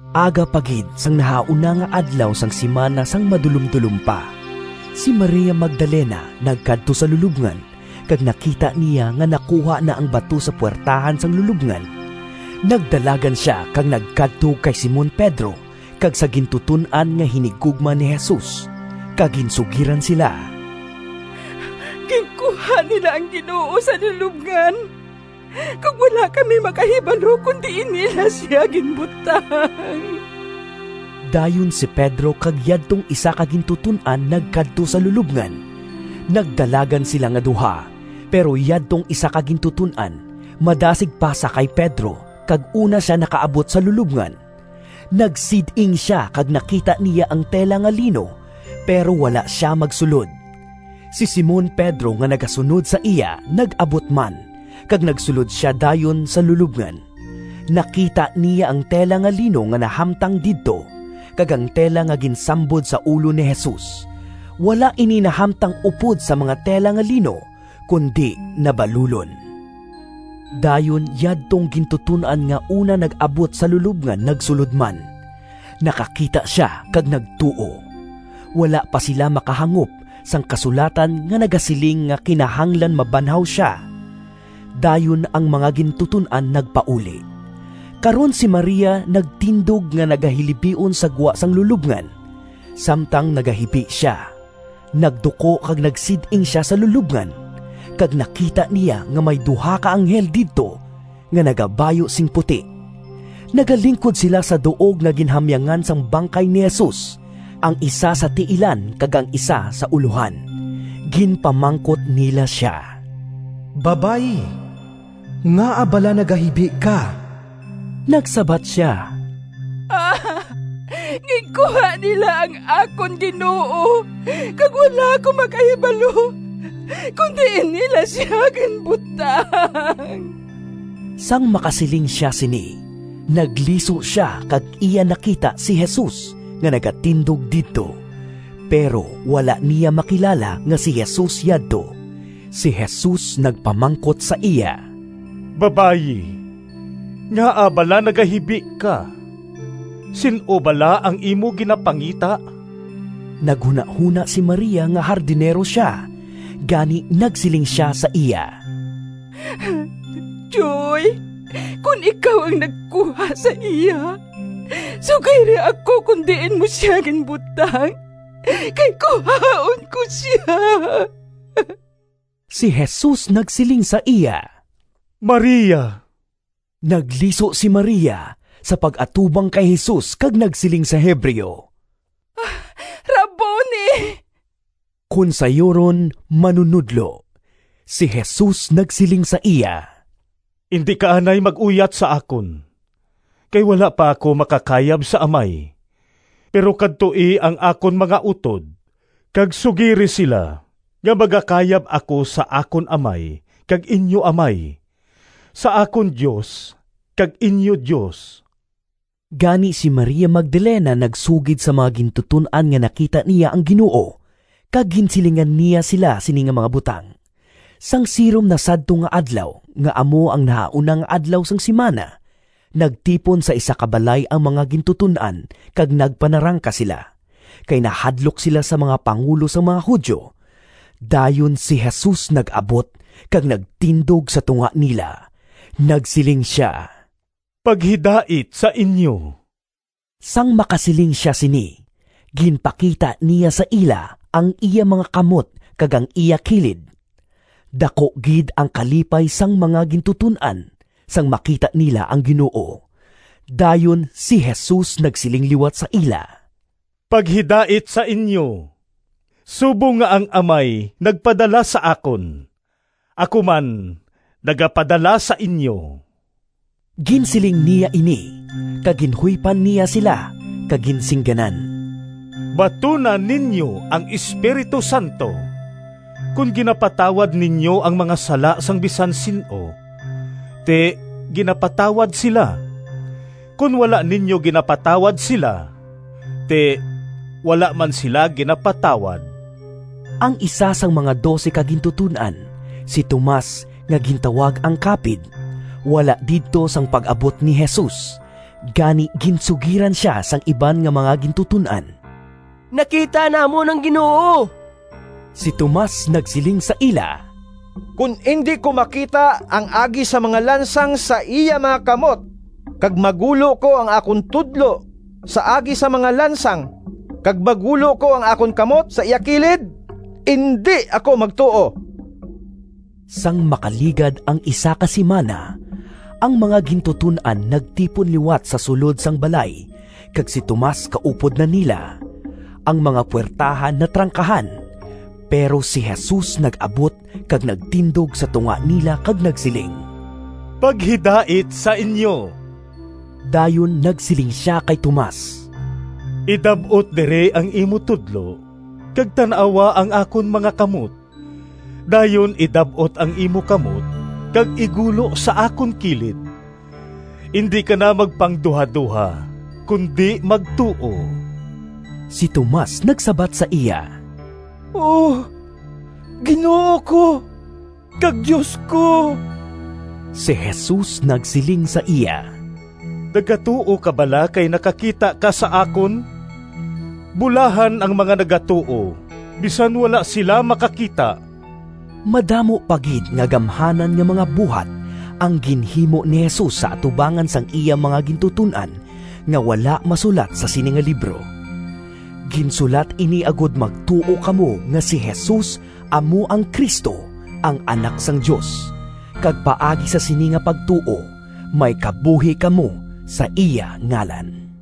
Aga pa gid sang nahauna nga adlaw sang simana sang madulomdulom pa, si Maria Magdalena nagkadto sa lulobngan, kag nakita niya nga nakuha na ang bato sa puwertahan sang lulobngan. Nagdalagan sia kag nagkadto kay Simon Pedro kag sa gintuton-an nga hinigugma ni Jesus, kag ginsugiran sila, “Ginkuha nila ang Ginoo sa lulobngan, kag wala kami makahibalo kon diin nila sia ginbutang!” Dayon si Pedro kag yadtong isa ka gintuton-an nagkadto sa lulobngan. Nagdalagan sila nga duha, pero yadtong isa ka gintuton-an madasig pa sa kay Pedro kag una sia nakaabot sa lulobngan. Nagsid-ing sia kag nakita niya ang tela nga lino, pero wala sia magsulod. Si Simon Pedro nga nagasunod sa iya, nag-abot man, kag nagsulod sia dayon sa lulobngan. Nakita niya ang tela nga lino nga nahamtang didto, kag ang tela nga ginsambod sa ulo ni Jesus. Wala ini nahamtang upod sa mga tela nga lino, kundi nabalulon. Dayon yadtong gintuton-an nga una nag-abot sa lulobngan nagsulod man. Nakakita sia kag nagtuo. (Wala pa sila makahangop sang kasulatan nga nagasiling nga kinahanglan mabanhaw sia.) Dayon ang mga gintuton-an nagpauli. Karon si Maria nagtindog nga nagahilibion sa gwa sang lulobngan. Samtang nagahibi sia, nagduko kag nagsid-ing sia sa lulobngan, kag nakita niya nga may duha ka anghel didto nga nagabayu sing puti. Nagalingkod sila sa duog nga ginhamyangan sang bangkay ni Jesus. Ang isa sa tiilan kag ang isa sa ulohan. Ginpamangkot nila sia, “Babayi, ngaa bala nagahibi ka?” Nagsabat sia, “Ginkuha nila ang akon Ginoo kag wala ako makahibalo kon diin nila sia ginbutang!” Sang makasiling sia sini, nagliso sia kag iya nakita si Jesus nga nagatindog didto, pero wala niya makilala nga si Jesus yadto. Si Jesus nagpamangkot sa iya, “Babayi, ngaa bala nagahibi ka? Sin-o bala ang imo ginapangita?” Naghunahona si Maria nga hardinero sia, gani nagsiling sia sa iya, “Tyoy, kon ikaw ang nagkuha sa iya, sugiri ako kon diin mo sia ginbutang, kay kuhaon ko sia.” Si Jesus nagsiling sa iya, “Maria!” Nagliso si Maria sa pag-atubang kay Jesus kag nagsiling sa Hebreo, “Rabboni!” (Kon sayuron, “Manunodlo.”) Si Jesus nagsiling sa iya, “Indi ka anay mag-uyat sa akon, kay wala pa ako makakayab sa Amay. Pero kadtoi ang akon mga utod kag sugiri sila nga magakayab ako sa akon Amay kag inyo Amay, sa akon Dios kag inyo Dios.” Gani si Maria Magdalena nagsugid sa mga gintuton-an nga nakita niya ang Ginoo, kag ginsilingan niya sila sini nga mga butang. Sang sirom na sadto nga adlaw nga amo ang nahauna nga adlaw sang simana, nagtipon sa isa ka balay ang mga gintuton-an kag nagpanarangka sila, kay nahadlok sila sa mga pangulo sang mga Judio. Dayon si Jesus nag-abot kag nagtindog sa tunga nila. Nagsiling sia, “Paghidait sa inyo.” Sang makasiling sia sini, ginpakita niya sa ila ang iya mga kamot kag ang iya kilid. Daku gid ang kalipay sang mga gintuton-an sang makita nila ang Ginoo. Dayon si Jesus nagsiling liwat sa ila, “Paghidait sa inyo. Subong nga ang Amay nagpadala sa akon, ako man nagapadala sa inyo.” Ginsiling niya ini, kag ginhuypan niya sila kag ginsingganan, “Batuna ninyo ang Espiritu Santo. Kon ginapatawad ninyo ang mga sala sang bisan sin-o, ti ginapatawad sila; kon wala ninyo ginapatawad sila, ti wala man sila ginapatawad.” Ang isa sang mga dose ka gintuton-an, si Tomas nga gintawag ang Kapid, wala didto sang pag-abot ni Jesus. Gani ginsugiran sia sang iban nga mga gintuton-an, “Nakita namon ang Ginoo!” Si Tomas nagsiling sa ila, “Kon indi ko makita ang agi sang mga lansang sa iya mga kamot, kag magulo ko ang akon tudlo sa agi sang mga lansang, kag magulo ko ang akon kamot sa iya kilid, indi ako magtuo.” Sang makaligad ang isa ka simana, ang mga gintuton-an nagtipon liwat sa sulod sang balay kag si Tomas kaupod na nila. Ang mga puwertahan natrangkahan, pero si Jesus nag-abot kag nagtindog sa tunga nila kag nagsiling, “Paghidait sa inyo.” Dayon nagsiling sia kay Tomas, “Idab-ot diri ang imo tudlo, kag tan-awa ang akon mga kamot. Dayon idab-ot ang imo kamot kag igulo sa akon kilid. Indi ka na magpangduhadoha, kundi magtuo!” Si Tomas nagsabat sa iya, “Ginoo ko kag Dios ko!” Si Jesus nagsiling sa iya, “Nagatuo ka bala kay nakakita ka sa akon? Bulahan ang mga nagatuo bisan wala sila makakita!” Madamo pa gid nga gamhanan nga mga buhat ang ginhimo ni Jesus sa atubangan sang iya mga gintuton-an nga wala masulat sa sini nga libro. Ginsulat ini agod magtuo kamo nga si Jesus amo ang Cristo, ang Anak sang Dios, kag paagi sa sini nga pagtuo may kabuhi kamo sa iya ngalan.